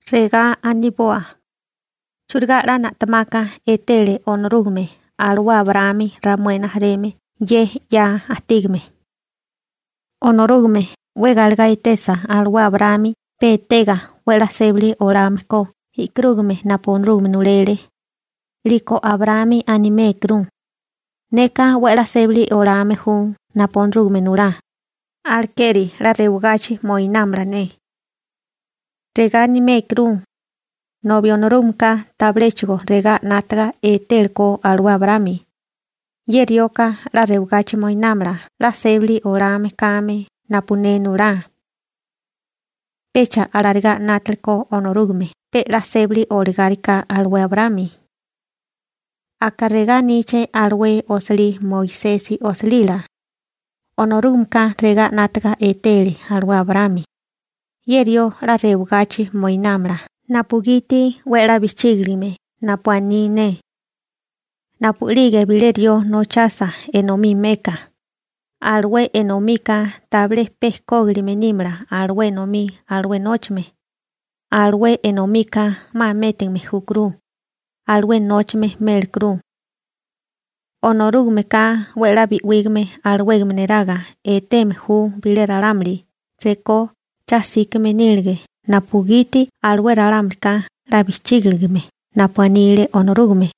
Regá aniboa: ¿Churigá 'la na'temaka etele Onorúgame alué Abraámi ramué rijimala ye 'ya ajtígame? Onorúgame 'we galegá etesa alué Abraámi pe etega 'we 'la sébali olame ko e'karúgame napu Onorúgame nulele, 'liko Abraámi animékuru: Neka 'we 'la sébali olame ju napu Onorúgame nulá, alekeri 'la rewagachi moinámala ne. Regá animékuru, nobi Onorúgameka tabiléchigo regá 'nátaga etélekó alué Abraámi: «Ye rioka 'la rewagachi moinámala 'la sébili olame kame napu ne nulá.» Pecha alarigá 'nátalekó Onorúgame pe 'la sébili olagáriká alué Abraámi. Aka regá aníché alué osilí Moisesi osilila: «Onorúgameka regá 'nátaga etele alué Abraámi: Ye rió 'la rewagachi moinámala napugiti 'we 'la bijchígiligame napu aní ne.» Napu'lige bilé rió nochasa enomí meka, alué enomika tabilé pe kógilime nímala alué enomí alué nóchame, alué enomika 'ma métigame júkuru, alué nóchame mélekuru. Onorúgameka 'we 'la bi'wígame alawégame neraga eteme ju bilé ralámuli rekó cha 'síkame nílige napugiti alué ralámulika 'la bijchígiligame napu anile Onorúgame.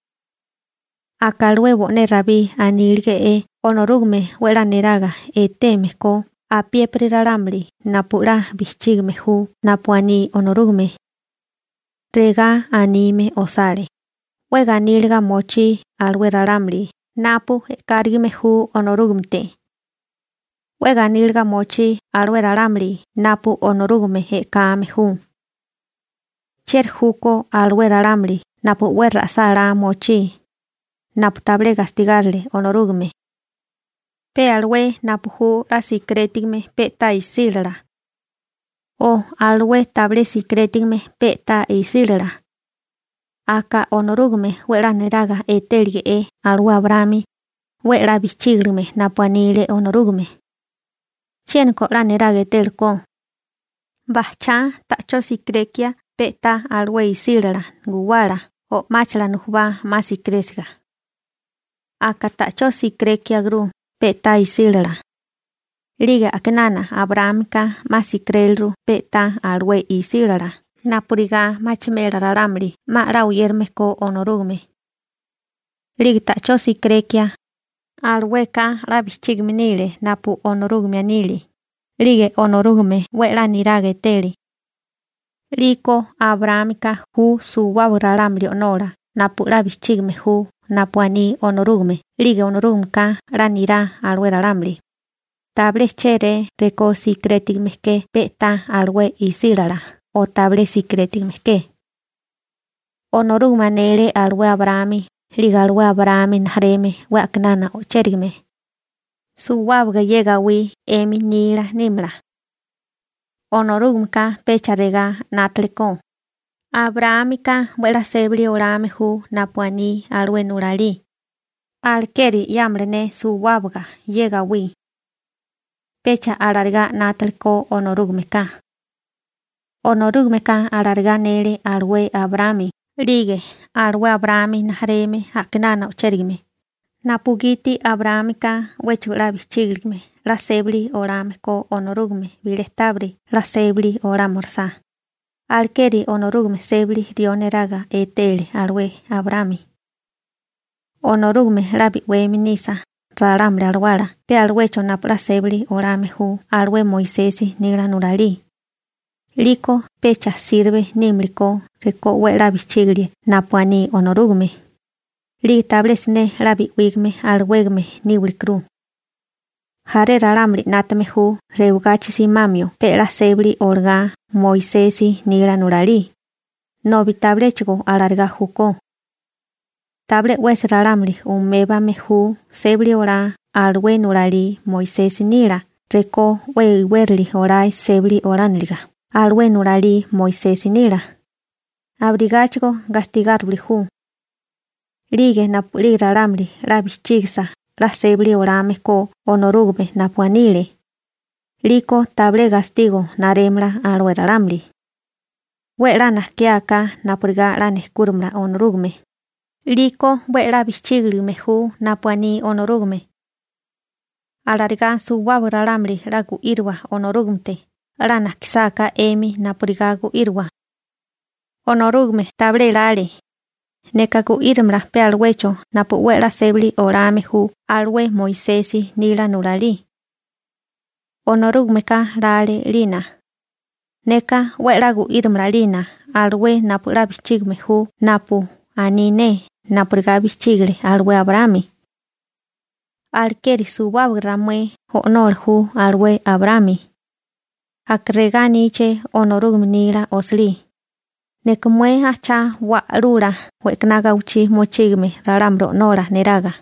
Aka alué bo'né Rabí anílege'é Onorúgame 'we 'la neraga eteme ko apiépiri ralámuli napu 'la bijchígime ju napu aní Onorúgame. Regá anime osale: 'We ganíliga mochí alué ralámuli napu e'kárigime ju Onorúgamete. 'We ganíliga mochí alué ralámuli napu Onorúgame e'kame ju. ¿Chieri júkó alué ralámuli napu 'we ra'sálá mochí, napu tabilé gastigárile Onorúgame? ¿Pe alué napu ju 'la sikirétigame pe'tá isílala o alué tabilé sikirétigame pe'tá isílala? ¿Aka Onorúgame 'we 'la neraga etélige'é alué Abraámi, 'we 'la bijchígilime napu anile Onorúgame? ¿Chiéniko 'la neraga etélekó? ¿Bajchá ta'chó sikirekia pe'tá alué isílala guwala o máchala nujubá 'ma sikirésiga? Aka ta'chó sikirékiaguru pe'tá isílala. 'Lige a'kinana Abraámika 'ma sikiréliru pe'tá alué isílala napurigá machimela ralámuli 'ma a'lá oyérame ko Onorúgame. 'Lige ta'chó sikirekia, alueka 'la bijchígime nile napu Onorúgame anile, 'lige Onorúgame 'we a'lá niraga etele. 'Liko Abraámika ju suwábaga ralámuli o'nola napu 'la bijchígame ju napu aní Onorúgame 'lige Onorúgameka 'la nirá alué ralámuli, tabilé chéré rekó sikirétigame ke pe'tá alué isílala o tabilé sikirétigame ke. Onorúgame anele alué Abraámi 'lige alué Abraámi rijimala 'we a'kinana o'chérigame: «Suwábaga ye gawí 'emi nila nímala.» Onorúgameka pecha regá 'nátalekó: «Abraámika 'we 'la sébali olame ju napu aní alué nulalí, alekeri 'yámala ne suwábaga ye gawí.» Pecha alarigá 'nátalekó Onorúgameka. Onorúgameka alarigá anele alué Abraámi 'lige alué Abraámi rijimala a'kinana o'chérigame napugiti Abraámika 'wéchigo 'la bijchígiligame 'la sébali olame ko Onorúgame bilé tábiri 'la sébali olámirisá, alekeri Onorúgame sébali rió neraga etele alué Abraámi. Onorúgame 'la bi'weme nisa ralámuli alawala pe aluecho napu 'la sébali olame ju alué Moisesi nila nulalí, 'liko pecha sirbe nímilikó rekó 'we 'la bijchígilie napu aní Onorúgame, 'lige tabilé siné 'la bi'wígame alawégame níwilikuru. Jaré ralámuli 'nátame ju rewagachi simamio pe 'la sébali olagá Moisesi nila nulalí, nobi tabiléchigo alarigá júkó. Tabilé 'wesi ralámuli umébame ju sébali olá alué nulalí Moisesi nila rekó 'we iwérali olae sébali olániliga alué nulalí Moisesi nila, abirigáchigo gastigáriwili ju. 'Lige napu'lige ralámuli 'la bijchígisa 'la sébali olame ko Onorúgame napu anile, 'liko tabilé gastigo narémala alué ralámuli. 'We 'la najkiáká napurigá 'la nejkúrimala Onorúgame, 'liko 'we 'la bijchígilime ju napu aní Onorúgame. Alarigá suwábaga ralámuli 'la gu'íriwa Onorúgamete 'la najkisáká 'emi napurigá gu'íriwa. Onorúgame tabilé lale: «Neka gu'írimala pe aluecho napu 'we 'la sébali olame ju alué Moisesi nila nulalí.» Onorúgameka lale 'lina: «Neka 'we 'la gu'írimala 'lina alué napu 'la bijchígime ju napu aní ne napurigá bijchígile alué Abraámi.» Alekeri suwábaga ramué o'nola ju alué Abraámi. Aka regá aníché Onorúgame nila osilí: «Neka mué ajchá wa'lula we'kaná gawichí mochígame ralámuli o'nola neraga.»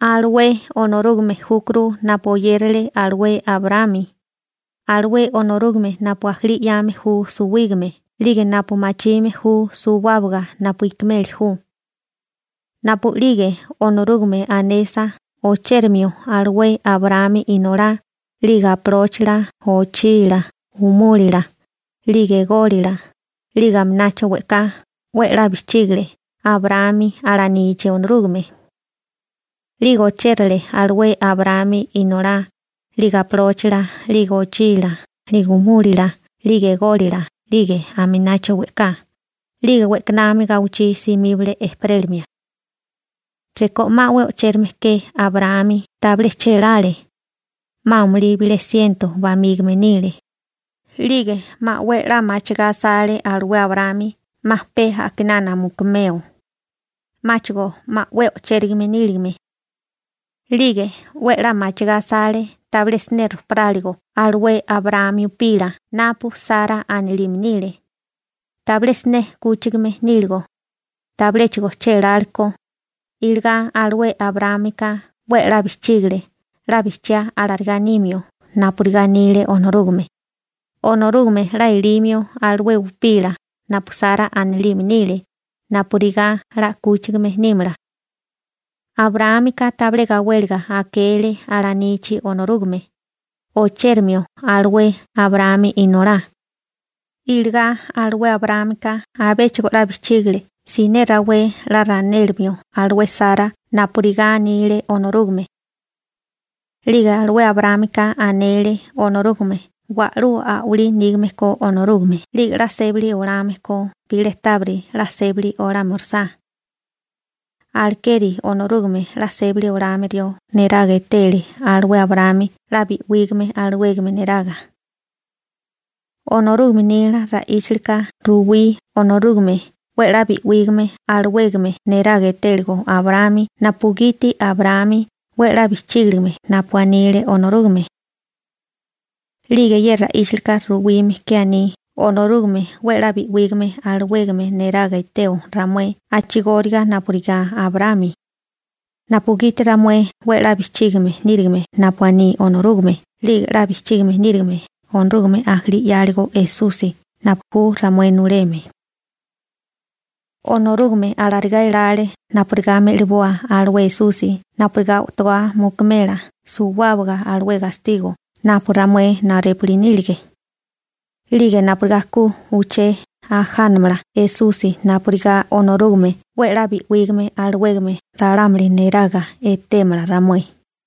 Alué Onorúgame júkuru napu oyérale alué Abraámi, alué Onorúgame napu ajalí 'yame ju suwígame 'lige napu machime ju suwábaga napu ikimeli ju. Napu'lige Onorúgame anesa ochérimio alué Abraámi inolá 'lige apalóchila, ochila, umúlila, 'lige ególila, 'lige aminacho we'ká, 'we 'la bijchígile Abraámi alanichi Onorúgame. 'Lige ochérale alué Abraámi inolá 'lige apalóchila 'lige ochila, 'lige umúlila 'lige ególila 'lige aminacho we'ká, 'lige we'kanami gawichí simíbale ejperélimia. Rekó 'ma 'we o'chérame ke Abraámi, tabilé chélále, 'ma amulí bilé siento bamígame nile, 'lige 'ma 'we 'la machigá asale alué Abraámi 'ma pe a'kinana mukumeo, 'máchigo 'ma 'we o'chérigame níligame, 'lige 'we 'la machigá asale tabilé siné rojparáligo alué Abraámi upila napu Sara anilime nile, tabilé siné 'kúchigame níligo, tabiléchigo chélálekó, iligá alué Abraámika 'we 'la bijchígale 'la bijchiá alarigá nimio napurigá anile Onorúgame, Onorúgame 'la elimio alué upila napu Sara anilime nile napurigá 'la 'kúchigame nímala. Abraámika tabilé gawéliga akele alanichi Onorúgame, o'chérimio alué Abraámi inolá, iligá alué Abraámika abéchigo 'la bijchígale siné rawé 'la ranélimio alué Sara napurigá anile Onorúgame. 'Lige alué Abraámika anele Onorúgame wa'lú a'walí nígame ko Onorúgame 'lige 'la sébali olame ko bilé tábiri 'la sébali olámirisá. Alekeri Onorúgame 'la sébali olame rió neraga etele alué Abraámi 'la bi'wígame alawégame neraga. Onorúgame nila ra'íchalika ruwí Onorúgame 'we 'la bi'wígame alawégame neraga etéligo Abraámi napugiti Abraámi 'we 'la bijchígiligame napu anile Onorúgame. 'Lige ye ra'íchalika ruwime ke aní Onorúgame 'we 'la bi'wígame alawégame neraga eteo ramué a'chigóriga napurigá Abraámi, napugiti ramué 'we 'la bijchígime nírigime napu aní Onorúgame 'lige 'la bijchígime nírigime Onorúgame ajalí 'yáligo Esusi napu ju ramué nuleme. Onorúgame alarigá elale napurigá me'liboa alué Esusi napurigá o'togá mukumela suwábaga alué gastigo napu ramué narépuli nílige, 'lige napurigá ku uché ajánamala Esusi napurigá Onorúgame 'we 'la bi'wígame alawégame ralámuli neraga etémala ramué.